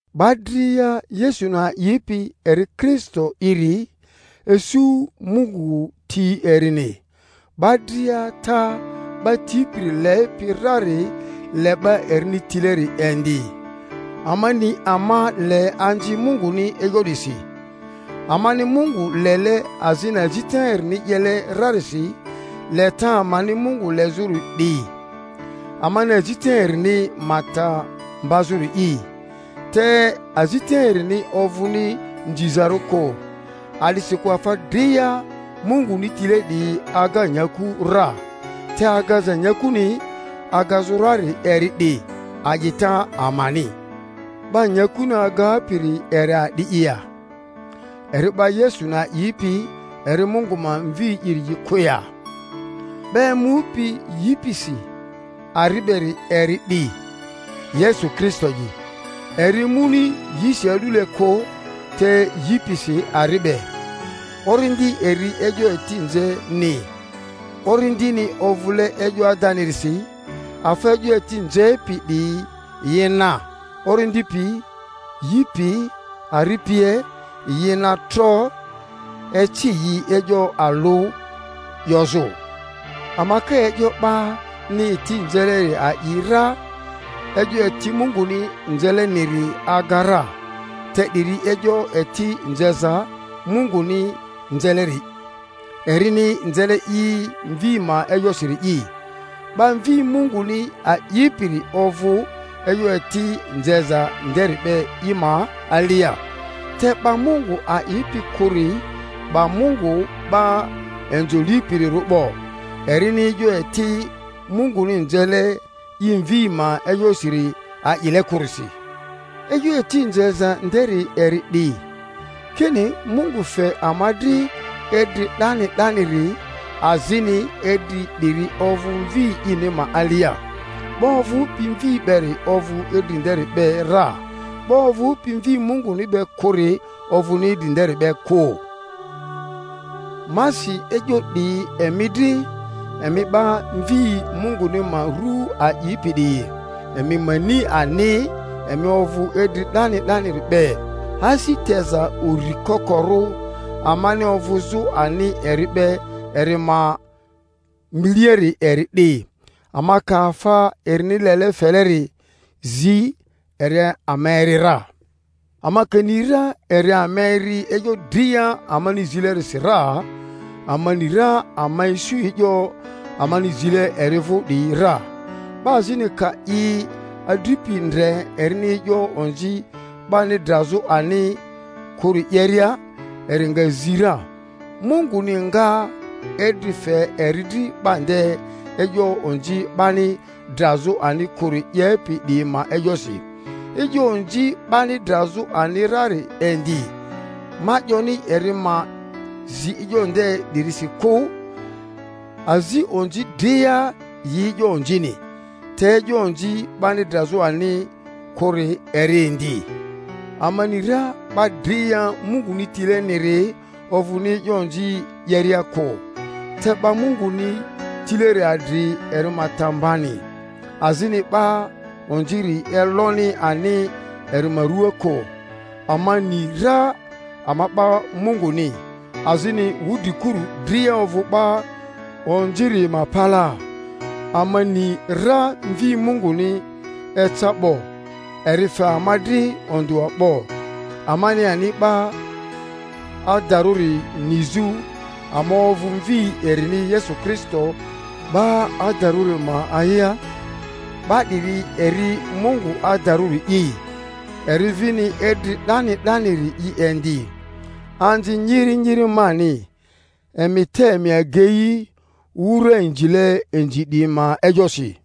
'Ba dria Yesuni a'ipi eri Kristo'iri, isu Mungu ti erini; 'ba dria ata 'ba tipiri lepi rari le 'ba erini tileri indi. Ama ni ama le anzi Munguni e'yo 'disi, amani Mungu lele azini azita erini 'yele rarisi. Leta amani Mungu lezᴜri 'di, amani azita erini ma ta mbazᴜri'i. Te azita erini ovᴜni nzizarᴜ kᴜ. A'disikᴜ afa dria Munguni tile 'diyi aga nyaku ra; te agaza nyakuni agazᴜ rari eri 'di, a'ita amani. 'Ba nyakuni agapiri eri a'di'i ya? Eri 'ba Yesuni a'ipi eri Mungu ma Mvi'iri kᴜ ya? 'Ba emupi yi pisi ari beri eri 'di, Yesu Kristo'i; eri emuni yisi a'dule kᴜ, te yi pisi ari be. Orindi eri e'yo eti nzeni, Orindini ovᴜle e'yo adanirisi. Afa e'yo eti nzepi 'diyi yi na, Orindi pi, yi pi, ari pie; yi na tro eci yi e'yo alᴜ 'yozᴜ. Ama ka e'yo 'bani eti nzeleri a'i ra, e'yo eti Munguni nzeleniri aga ra; te 'diri e'yo eti nzeza Munguni nzeleri, erini nzele i Mvi ma e'yosiri’i. 'Ba Mvi Munguni aipiri ovᴜ e'yo eti nzeza nderi be i ma alia. Te 'ba Mungu a'ipi kᴜri 'ba Mungu 'ba inzo lipirirᴜ 'bo, erini e'yo eti Munguni nzele i Mvi ma e'yosiniri a'ile kᴜrisi. E'yo eti nzeza nderi eri 'di, kini, Mungu fe ama dri idri 'dani 'daniri, azini idri 'diri ovᴜ Mvi ini ma alia. 'Ba ovᴜpi Mvi beri ovᴜ idri nderi be ra; 'ba ovᴜpi Mvi Munguni be kᴜri ovᴜni idri nderi be kᴜ. Ma si e'yo 'diyi emi dri, emi 'ba Mvi Munguni ma ru aipi 'diyi, emi ma ni ani emi ovᴜ idri 'dani 'daniri be. Asi teza uri kokorᴜ amani ovᴜzᴜ ani eri be eri ma miliari eri 'di, ama ka afa erini lele feleri zi, eri ama eri ra. Ama ka ni ra eri ama eri e'yo dria amani zilerisi ra, ama ni ra ama isu e'yo amani zile eri vᴜ 'diyi ra. 'Ba azini ka i adripi ndre erini e'yo onzi 'bani drazᴜ ani kᴜri 'yeria, eri nga zi ra, Munguni mga idri fe eri dri 'ba nde e'yo onzi 'bani drazᴜ ani kᴜri 'yepi 'diyi ma e'yosi. E'yo onzi 'bani drazᴜ ani rari indi; ma 'yoni eri ma zi e'yo nde 'dirisi kᴜ. Azi onzi dria yi e'yo onzini, te e'yo onzi 'bani drazᴜ ani kᴜri eri indi. Ama ni ra 'ba dria Munguni tileniri ovᴜni e'yo onzi 'yeria kᴜ, te 'ba Munguni tileri adri eri ma ta mbani, azini 'ba onziri eloni ani eri ma rᴜa kᴜ. Ama ni ra ama 'ba Munguni, azini wudrikuru dria ovᴜ 'ba onziri ma palaa. Ama ni ra Mvi Munguni eca 'bo, eri fe ama dri ondᴜa 'bo, amani ani 'ba adarᴜri nizᴜ; ama ovᴜ Mvi erini Yesu Kristo 'ba adarᴜri ma a'ia. 'Ba 'diri eri Mungu adarᴜri'i, eri vini idri 'dani 'daniri'i indi. Anzi nyiri nyiri mani, emi te emi agei wura inzile inzi 'diyi ma e'yosi.